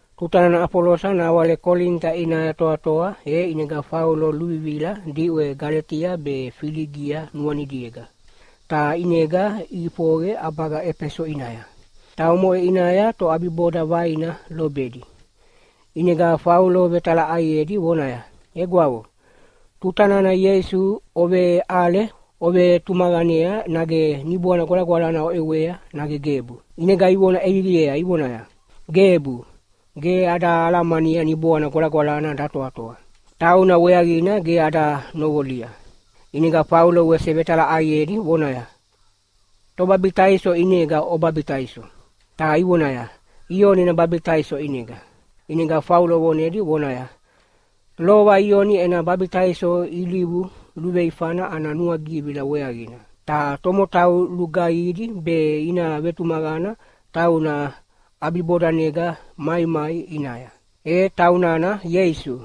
Tuta nana Afolosa nawale Kolinita ʼinaya toatoa e ʼinega Faulo luvivila diʼwe Galetia be Filigia nuanidiega, ta ʼinega ʼifoqe ʼabaga Efeso ʼinaya. Ta omoʼe ʼinaya toʼabiboda vaina lobedi. ʼInega Faulo vetalaʼaiedi vonaya, “Egwavo, tuta nana Ieisu oveʼale ovetumaqanea nage Niboana Gwalagwalana oʼewea nage gebu?” ʼInega ivona ʼeviviea ivonaya, “Gebu, ge ada alamania Niboana Gwalagwalana datoatoa. Tauna weaqina ge ada noqolia.” ʼInega Faulo wese vetalaʼaiedi vonaya, “Tobabitaiso ʼinega obabitaiso?” Ta ivonaya, “Ioni ena babitaiso ʼinega.” ʼInega Faulo vonedi vonaya, “Lova Ioni ena babitaiso ilivu luveifana ana nuagivila weaqina. Ta tomotau lugaihidi be ina vetumaqana tauna ʼabibodanega maimai ʼinaya, e taunana Ieisu.”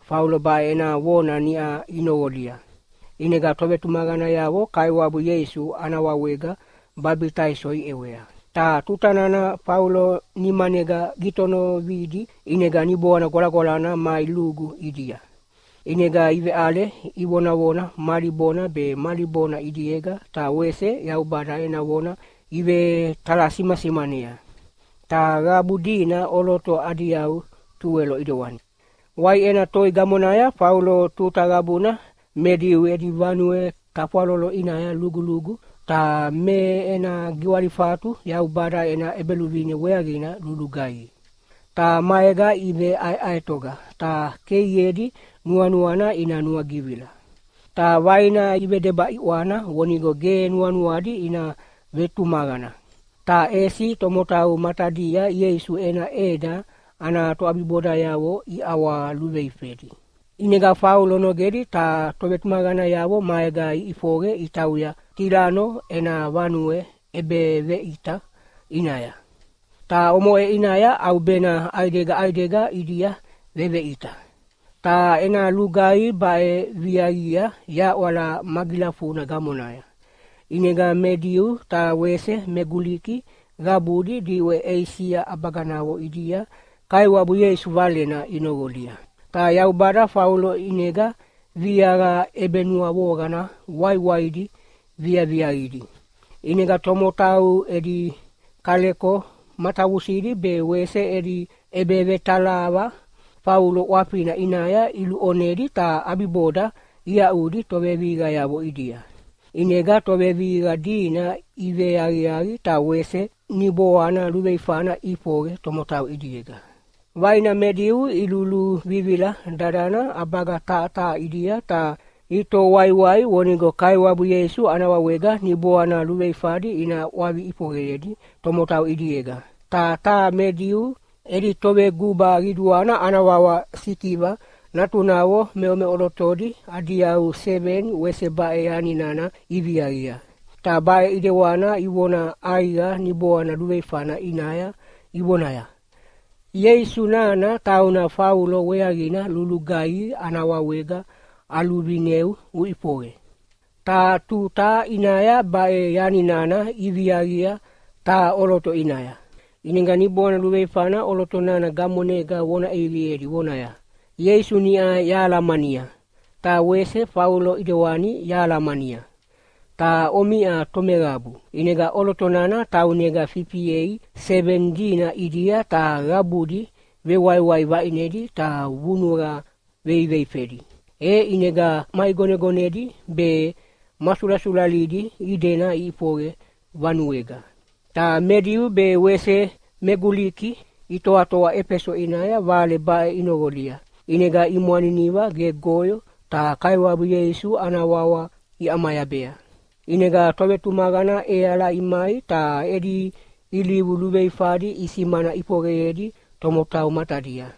Faulo baʼe ena vona niʼa inoqolia, ʼinega tovetumaqanayavo Kaiwabu Ieisu ana wawega babitaiso iʼewea. Ta tuta nana Faulo nimanega gitonividi ʼinega Niboana Gwalagwalana mai lugu ʼidia. ʼInega iveʼale ivonavona mali bona be mali bona ʼidiega ta wese Yaubada ena vona ivetalasimasimanea. Ta qabu dina ʼoloto adi yau tuwelo ʼidewani. Waiʼena toi gamonaya Faulo tuta qabuna me Diu edi vanue tafwalolo ʼinaya lugulugu, ta me ena giwalifatu Yaubada ena ʼEbeluvine weaqina lulugaihi. Ta maega iveʼaeʼaetoga ta keiedi nuanuana ina nuagivila. Ta vaina ivedeba ʼiʼwana vonigo ge nuanuadi ina vetumaqana, ta ʼesi tomotau matadia Ieisu ena ʼeda ana toʼabibodayavo iʼawaluveifedi. ʼInega Faulo nogedi ta tovetumaqanayavo maega iʼifoqe itauya Tilano ena vanue ʼebeveʼita ʼinaya. Ta omoʼe ʼinaya ʼaubena ʼaidega ʼaidega ʼidia veveʼita. Ta ena lugaihi baʼe viaqia yaʼwala magilafuna gamonaya, ʼinega me Diu ta wese me Guliki qabudi diʼwe Eisia ʼabaganavo ʼidia Kaiwabu Ieisu Valena inoqolia. Ta Yaubada Faulo ʼinega viaqa ʼebenuavoqana waiwaidi viaviaqidi. ʼInega tomotau edi kaleko matavusidi be wese edi ʼebevetalaqa Faulo ʼwafina ʼinaya iluʼonedi ta ʼabiboda iaʼudi tovevihiqayavo ʼidia. ʼInega tovevihiqa dina iveaqiaqi ta wese niboana luveifana ʼifoqe tomotau ʼidiega. Vaina me Diu iluluvivila dadana ʼabaga taha taha ʼidia ta itoho waiwai vonigo Kaiwabu Ieisu ana wawega niboana luveifadi ina ʼwavi ʼifoqeyedi tomotau ʼidiega. Ta taha me Diu edi toveguba qiduana ana wawa Sikiva natunavo meʼomeʼolotodi adi yau seveni wese baʼe yani nana iviaqia. Ta baʼe ʼidewana ivona ʼaiqa niboana luveifana ʼinaya ivonaya, “Ieisu nana tauna Faulo weaqina lulugaihi ana wawega aluvineu uʼifoqe!” Taha tuta ʼinaya baʼe yani nana iviaqia taha ʼoloto ʼinaya, ʼinega niboana luveifana ʼoloto nana gamonega vona ʼeviviedi vonaya, “Ieisu niʼa yahalamania, ta wese Faulo ʼidewani yahalamania. Ta omiʼa tomeqabu?” ʼInega ʼoloto nana taunega fifiei seveni dina ʼidia ta qabudi vewaiwai vaʼinedi ta vunuqa veiveifedi, e ʼinega maʼigonegonedi be ma sulasulalidi idena iʼifoqe vanuega. Ta me Diu be wese me Guliki itoatoa Efeso ʼinaya vale baʼe inoqolia, ʼinega imwaniniva gegoyo ta Kaiwabu Ieisu ana wawa iʼamayabea. ʼInega tovetumaqana ʼeala imai ta edi ilivu luveifadi isimana ʼifoqeyedi tomotau matadia.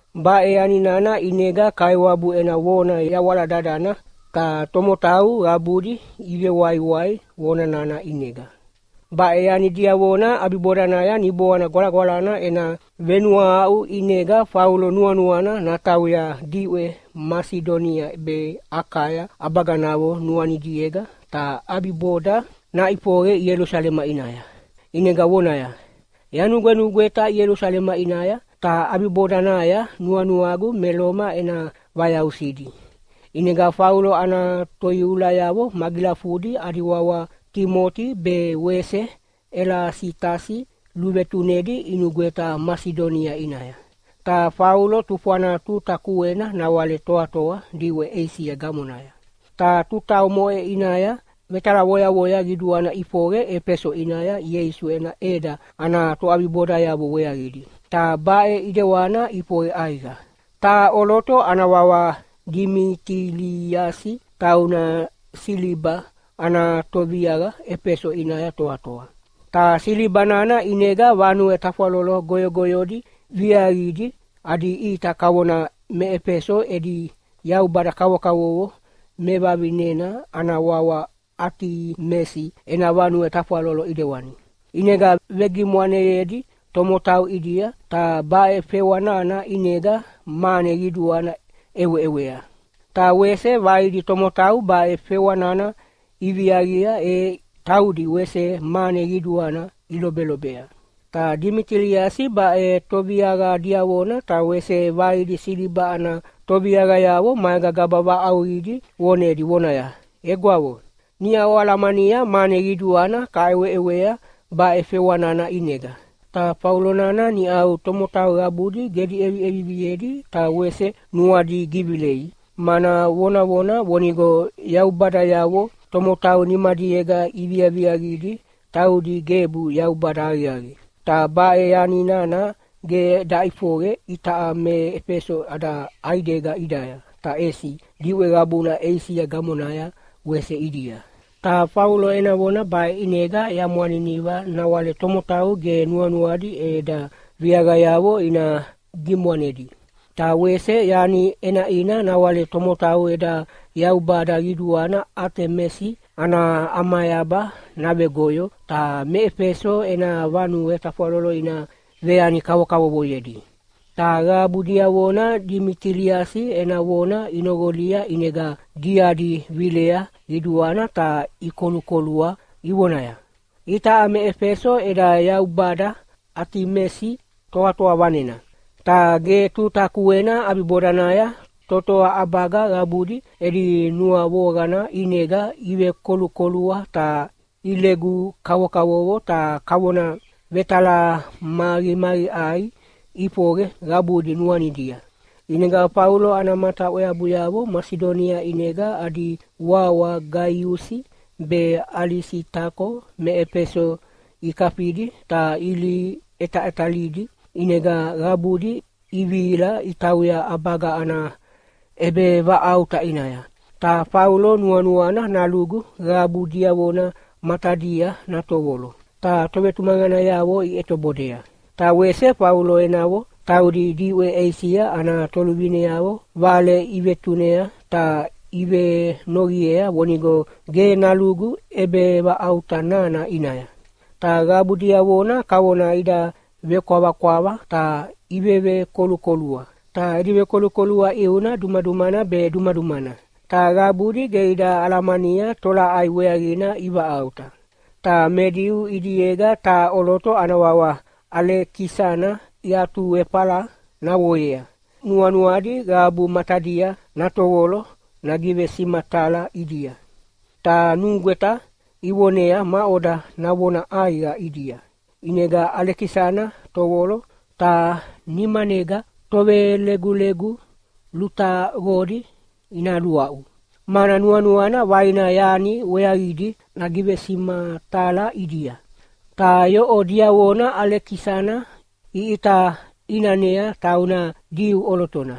Baʼe yani nana ʼinega Kaiwabu ena vona yawala dadana ta tomotau qabudi ivewaiwai vona nana ʼinega. Baʼe yani diavona ʼabibodanaya Niboana Gwalagwalana ena venuahaʼu ʼinega Faulo nuanuana natauya diʼwe Masidonia be Akaya ʼabaganavo nuanidiega ta ʼabiboda naʼifoqe Ielusalema ʼinaya, ʼinega vonaya, “Yanugwenugweta Ielusalema ʼinaya, ta ʼabibodanaya nuanuagu me Loma ena vayausidi.” ʼInega Faulo ana toiulayavo magilafudi adi wawa Timoti be wese Elasitasi luvetunedi inugweta Masidonia ʼinaya. Ta Faulo tufwana tuta kuena nawale toatoa diʼwe Eisia gamonaya. Ta tuta omoʼe ʼinaya vetalavoyavoya qiduana ʼifoqe Efeso ʼinaya Ieisu ena ʼeda ana toʼabibodayavo weaqidi, ta baʼe ʼidewana ʼifoqe ʼaiqa. Taha ʼoloto ana wawa Dimitiliasi tauna siliba ana toviaqa Efeso ʼinaya toatoa, ta siliba nana ʼinega vanue tafwalolo goyogoyodi viaqidi adi ʼita kavona me Efeso edi yaubada kavokavovo mevavinena ana wawa Atimesi ena vanue tafwalolo ʼidewani. ʼInega vegimwaneyedi tomotau ʼidia, ta baʼe fewa nana ʼinega mane qiduana ʼeweʼewea. Ta wese vaidi tomotau baʼe fewa nana iviaqia e taudi wese mane qiduana ilobelobea. Ta Dimitiliasi baʼe toviaqa diavona ta wese vaidi siliba ana toviaqayavo maega gaba vaʼauqidi vonedi vonaya, “Egwavo, niʼa oalamania mane qiduana kaʼeweʼewea baʼe fewa nana ʼinega. Ta Faulo nana niʼau tomotau qabudi gedi ʼeviʼeviviedi ta wese nuadi givilei, mana vonavona vonigo yaubadayavo tomotau nimadiega iviaviaqidi taudi gebu yaubada aqiaqi. Ta baʼe yani nana ge daʼifoqe itaʼa me Efeso ada ʼaidega ʼidaya, ta ʼesi diʼwe qabuna Eisia gamonaya wese ʼidia. Ta Faulo ena vona baʼe ʼinega yamwaniniva nawale tomotau ge nuanuadi eda viaqayavo ina gimwanedi. Ta wese yani ʼenaʼina nawale tomotau eda yaubada qiduana Atimesi ana ʼamayaba navegoyo ta me Efeso ena vanue tafwalolo ina veyani kavokavovoyedi.” Ta qabu diavona Dimitiliasi ena vona inoqolia ʼinega diadi vilea qiduana ta ikolukolua ivonaya, “Itaʼa me Efeso eda yaubada Atimesi toatoa vanena!” Ta ge tuta kuena ʼabibodanaya totoa ʼabaga qabudi edi nuavoqana ʼinega ivekolukolua ta ilegu kavokavovo ta kavona vetalamaqimaqiʼai ʼifoqe qabudi nuanidia. ʼInega Faulo ana mata ʼweabuyavo Masidonia ʼinega adi wawa Gaiusi be Alisitako me Efeso ikafidi ta ilihi ʼetaʼetalidi, ʼinega qabudi ivihila itauya ʼabaga ana ʼebevaʼauta ʼinaya. Ta Faulo nuanuana nalugu qabu diavona matadia natovolo, ta tovetumaqanayavo iʼetobodea. Ta wese Faulo enavo, taudi diʼwe Eisia ana toluvineavo vale ivetunea ta ivenoqiea vonigo ge nalugu ʼebevaʼauta nana ʼinaya. Ta qabu diavona kavona ida vekwavakwava ta ivevekolukolua, ta edi vekolukolua ʼiuna dumadumana be dumadumana, ta qabudi ge ida alamania tolaʼai weaqina ivaʼauta. Ta me Diu ʼidiega taha ʼoloto ana wawa Alekisana iatuefala naqoyea nuanuadi qabu matadia natovolo nagivesimatala ʼidia, ta nugweta ivonea maʼoda navona ʼaiqa ʼidia. ʼInega Alekisana tovolo ta nimanega tovelegulegu lutaqodi ina luaʼu, mana nuanuana vaina yani weaqidi nagivesimatala ʼidia. Ta yoʼo diavona Alekisana iʼita ʼinanea tauna Diu ʼolotona,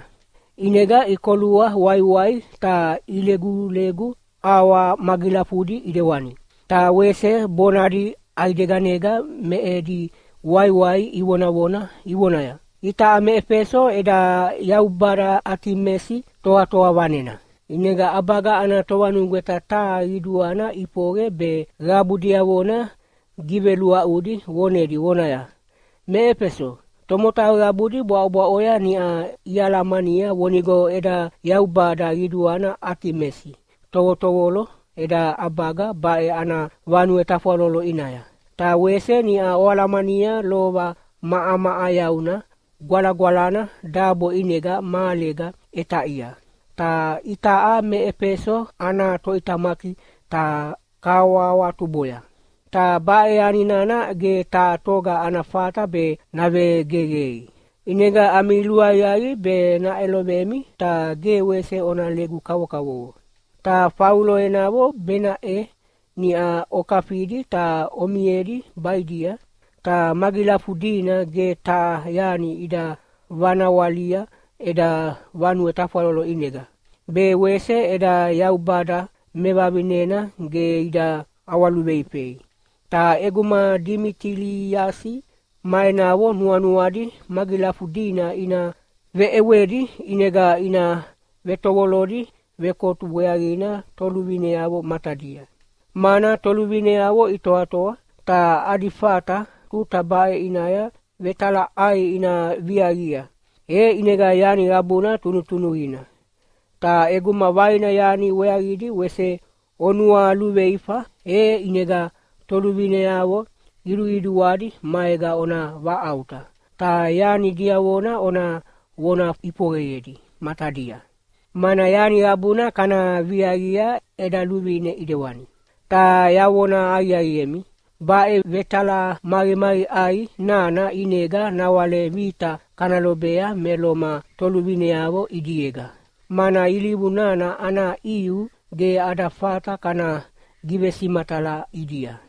ʼinega ikolua waiwai ta ilegulegu auwa magilafudi ʼidewani, ta wese bonadi ʼaideganega me edi waiwai ivonavona ivonaya, “Itaʼa me Efeso eda yaubada Atimesi toatoa vanena!” ʼInega ʼabaga ana tovanugweta taha qiduana ʼifoqe be qabu diavona giveluaʼudi vonedi vonaya, “Me Efeso, tomotau qabudi bwaʼobwaʼoya niʼa ialamania vonigo eda yaubada qiduana Atimesi tovotovolo eda ʼabaga baʼe ana vanue tafwalolo ʼinaya. Ta wese niʼa oalamania lova maʼamaʼayauna gwalagwalana dabo ʼinega mahalega ʼetaʼia, ta itaʼa me Efeso ana toʼitamaki ta kahawahawatuboya. Ta baʼe yani nana ge taha toga ana fata be navegeqei. ʼInega ami luaqiaqi be naʼelovemi ta ge wese ona legu kavokavovo. Ta Faulo enavo benaʼe niʼa okafidi ta omiedi baʼidia, ta magilafudina ge taha yani ida vanawalia eda vanue tafwalolo ʼinega, be wese eda yaubada mevavinena ge ida ʼawaluveifei. Ta ʼeguma Dimitiliasi ma enavo nuanuadi magilafudina ina veʼewedi ʼinega ina vetovolodi vekotu weaqina toluvineavo matadia, mana toluvineavo itoatoa, ta adi fata tuta baʼe ʼinaya vetalaʼai ina viaqia. E ʼinega yani qabuna tunutunuqina. Ta ʼeguma vaina yani weaqidi wese onualuveifa, e ʼinega toluvineavo qiduqiduadi maega ona vaʼauta, ta yani diavona ona vona ʼifoqeyedi matadia. Mana yani qabuna kana viaqia eda luvine ʼidewani. Ta yavona aqiaqiemi, baʼe vetalamaqimaqiʼai nana ʼinega nawale vita kana lobea me Loma toluvineavo ʼidiega, mana ilivu nana ana ʼiu ge ada fata kana givesimatala ʼidia.”